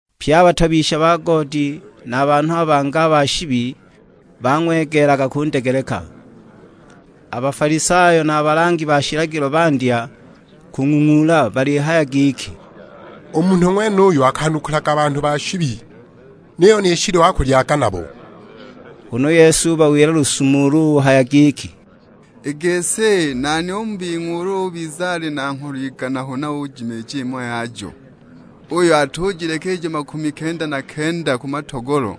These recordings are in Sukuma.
Pye a batobisha ba goodi na a banhu a bangi a ba shibi, bang'wegeelaga kundegeleka. A Bafalisayo na a balangi ba shilagilo bandya kung'ung'uula balihaya giki, "U munhu ng'wenuyu akwanukulaga banhu ba shibi; niyo ni shiliwa akulyaga nabo!" Huna u Yesu ubawila lusumo ulu uhaya giki, "I gisi nani u mu bing'we ulu ubiza ali na ngholo igana huna ujimiija imo yajo, uyo atujileka ijo makumi kenda na kenda ku matogolo,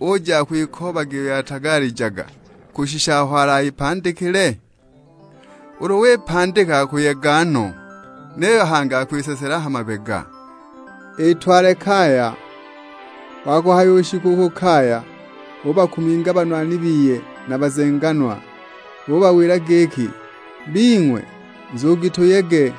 uja akwikoobaga iyo yatagalijaga, kushisha aho alayipandikile? Ulu wipandika akuyega no; niyo hangi akwisesela ha mabega, itwale kaya. Wa kuhayishisha u ku kaya, ubakuminga banwani biye na bazenganwa; ubawila giki, 'Bing'we, nzugi tuyege,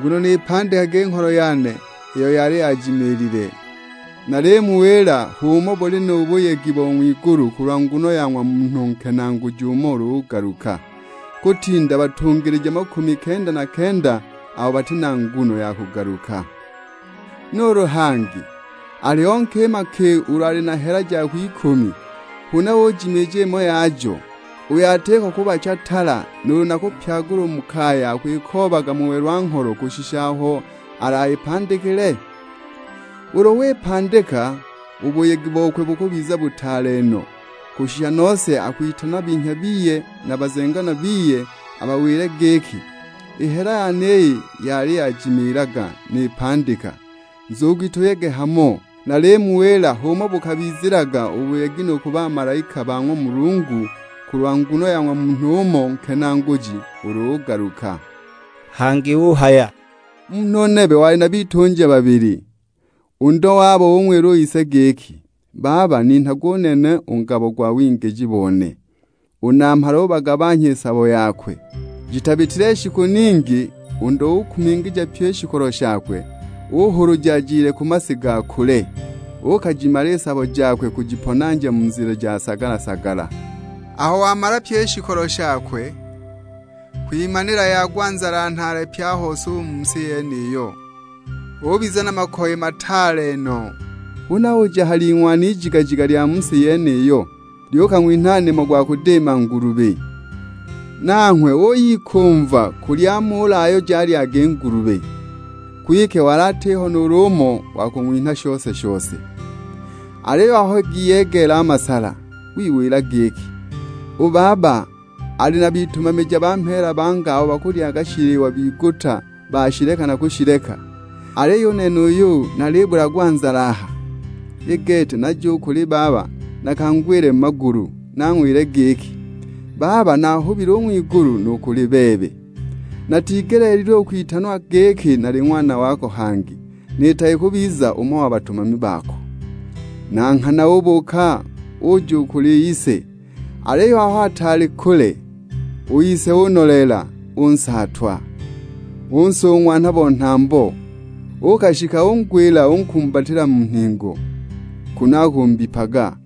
nguno nipandika i ngholo yane iyo yali yajimiilile!' Nalimuwila h'umo buli nu buyegi bo ng'wigulu kulwa nguno ya ng'wa munhu nkenaaguji umo ulu ugaluka; kutinda batungilija makumi kenda na kenda abo bati na nguno ya kugaluka!" "Nuulu hangi, aliho nkima ki ulu ali na hela i hela ijo jilihayiwa, buli yene u mpango gwayo gwali shilingi shihumbi shingi.' jakwe ikumi, huna ujimiija imo yajo, uyo atiko kubacha tala nuulu na kupyagula u mu kaya akwikoobaga mu welwa-ngholo, kushisha aho alayipandikile? Ulu wipandika u buyegi bokwe bukubiza butaale no, kushisha nose akwitana binhya biye na bazenganwa biye abawile giki, 'I hela yane iyi yali yajimiilaga nipandika; nzugi tuyege hamo!' Nalimuwila h'umo bukabizilaga u buyegi nu ku bamalaika ba ng'wa Mulungu, kulwa nguno ya ng'wa munhu umo nkenaaguji ulu ugaluka." Hangi uhaya, "Munhu nebe wali na bitunja babili. U ndo wabo ung'wila u ise giki, 'Baba ninhage u nene u ngabo go wingiji bone.' U namhala ubagabanhya i sabo yakwe. Jitabitile shiku ningi, u ndo ukumingija pyi i shikolo shakwe, uhuluja ajile ku masi ga kule. Uukajimala i sabo jakwe kujiponanja mu nzila ja sagala-sagala. Aho wamala pyi i shikolo shakwe, kwimanila yagwa nzala nhaale pye a hose u mu si yeniyo, ubiza na makoye mataale no! Huna uja ha ling'wana ijigajiga lya mu si yeniyo, lyukang'winha nimo gwa kuyudiima ngulubi. Nanghwe uyikumva kulya a muula ayo jalyaga i ngulubi, kwike wali atiho nuulu umo wa kung'winha shose-shose! Aliyo aho giyegeela a masala, wiwila giki, 'U baba ali na bitumamija ba mheela banga abo bakulyaga shiliwa biguta bashileka na kushileka, aliyo u nene uuyu nalibulagwa nzala aha! I gete naje u kuli baba nakangwile mu magulu nang'wile giki, "Baba naahubile u ng'wigulu nu kuli bebe. Natigeleelilwe u kwitanwa giki nali ng'wana wako hangi; niitage kubiza umo wa batumami bako!" ' Na nghana ubuuka uja u kuli ise, aliyo aho ataali kule, u ise unoleela, unsaatwa. Unsung'wanha bo nhambo. Uukashikila kungwila unkumbatila mu nhingo, kunu akumbipaga.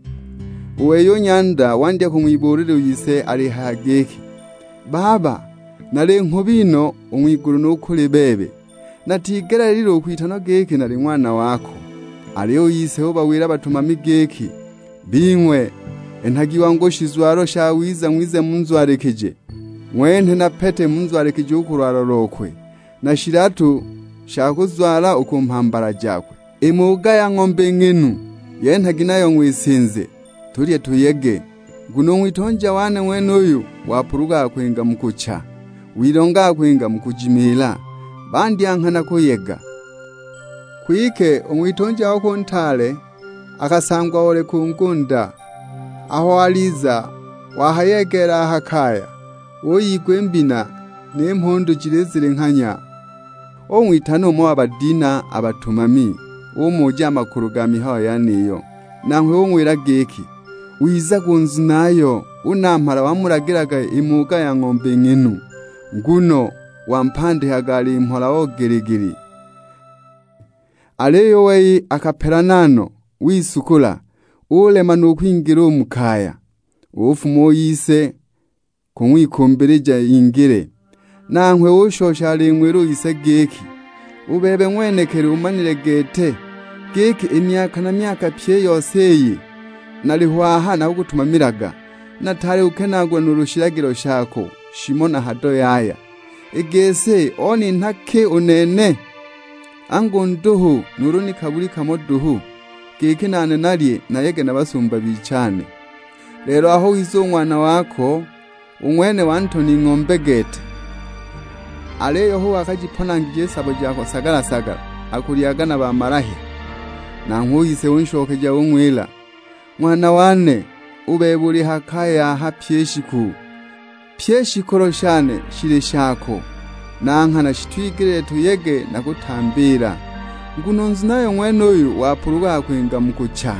U wei u nyanda wandya kung'wibuulila u ise alihaya giki, 'Baba, nali nghubi no, u ng'wigulu nu kuli bebe; natigeleelilwe u kwitanwa giki nali ng'wana wako!' Aliyo u ise ubawila a batumami giki, 'Bing'we, enhagi wangu shizwalo shawiza ng'wize munzwalikije; ng'wenhe na pete munzwalikije u ku lwala lokwe, na shilatu sha kuzwala u ku mhambala jakwe. I muuga ya ng'ombe, i ng'inu, yenhagi nayo ng'wisinze; tulye tuyege! Nguno u ng'witunja wane ng'wenuyu wapulugukaga kwinga mu kucha, wilongaga kwinga mu kujimiila!' Bandya nghana kuyega. Kwike u ng'witunja wakwe u ntaale akasangwa oli ku ngunda, aho aliza wahayegeela a ha kaya, uyigwa i mbina, ni mhundu jilizilinghanya. Ung'witana umo wa badinha a batumami, umuja a makulu ga mihayo yeniyo. Nanghwe ung'wila giki, 'Wizaga u nzunayo, u namhala wamulagilaga i muuga ya ng'ombe i ng'inu, nguno wampandikaga ali mhola o gili-gili!' Aliyo u wei akapelana no, wisukula; ulema nu kwingila u mu kaya. Ufuma u ise kung'wikumbilija ingile. Nanghwe ushosha aling'wila u ise giki, 'U bebe ng'wenekili umanile gete, giki i myaka na myaka pyi i yose iyi, naliho aha nakukutumamilaga, nataali kukenaagula nuulu shilagilo shako shimo na hado yaya; i gisi oninha ki u nene? Angu nduhu nuulu ni kabuli kamo duhu, giki nane nalye nayege na basumba bichane. Lelo aho wiza u ng'wana wako, u ng'wene wantona ing'ombe gete; aliyo hu wakajiponangije i sabo jako sagala-sagala, akulyaga na mamalahya!' Nanghwe u ise unshokeja ung'wila, 'Ng'wana wane, u bebe uli ha kaya aha pyi i shiku; pyi i shikolo shane shili shako. Na nghana shitwigeleelilwe tuyege na kutambiila, nguno u nzunayo ng'wenuyu wapulugukaga kwinga mu kucha,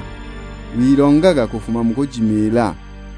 wilongaga kufuma mu kujimiila.' "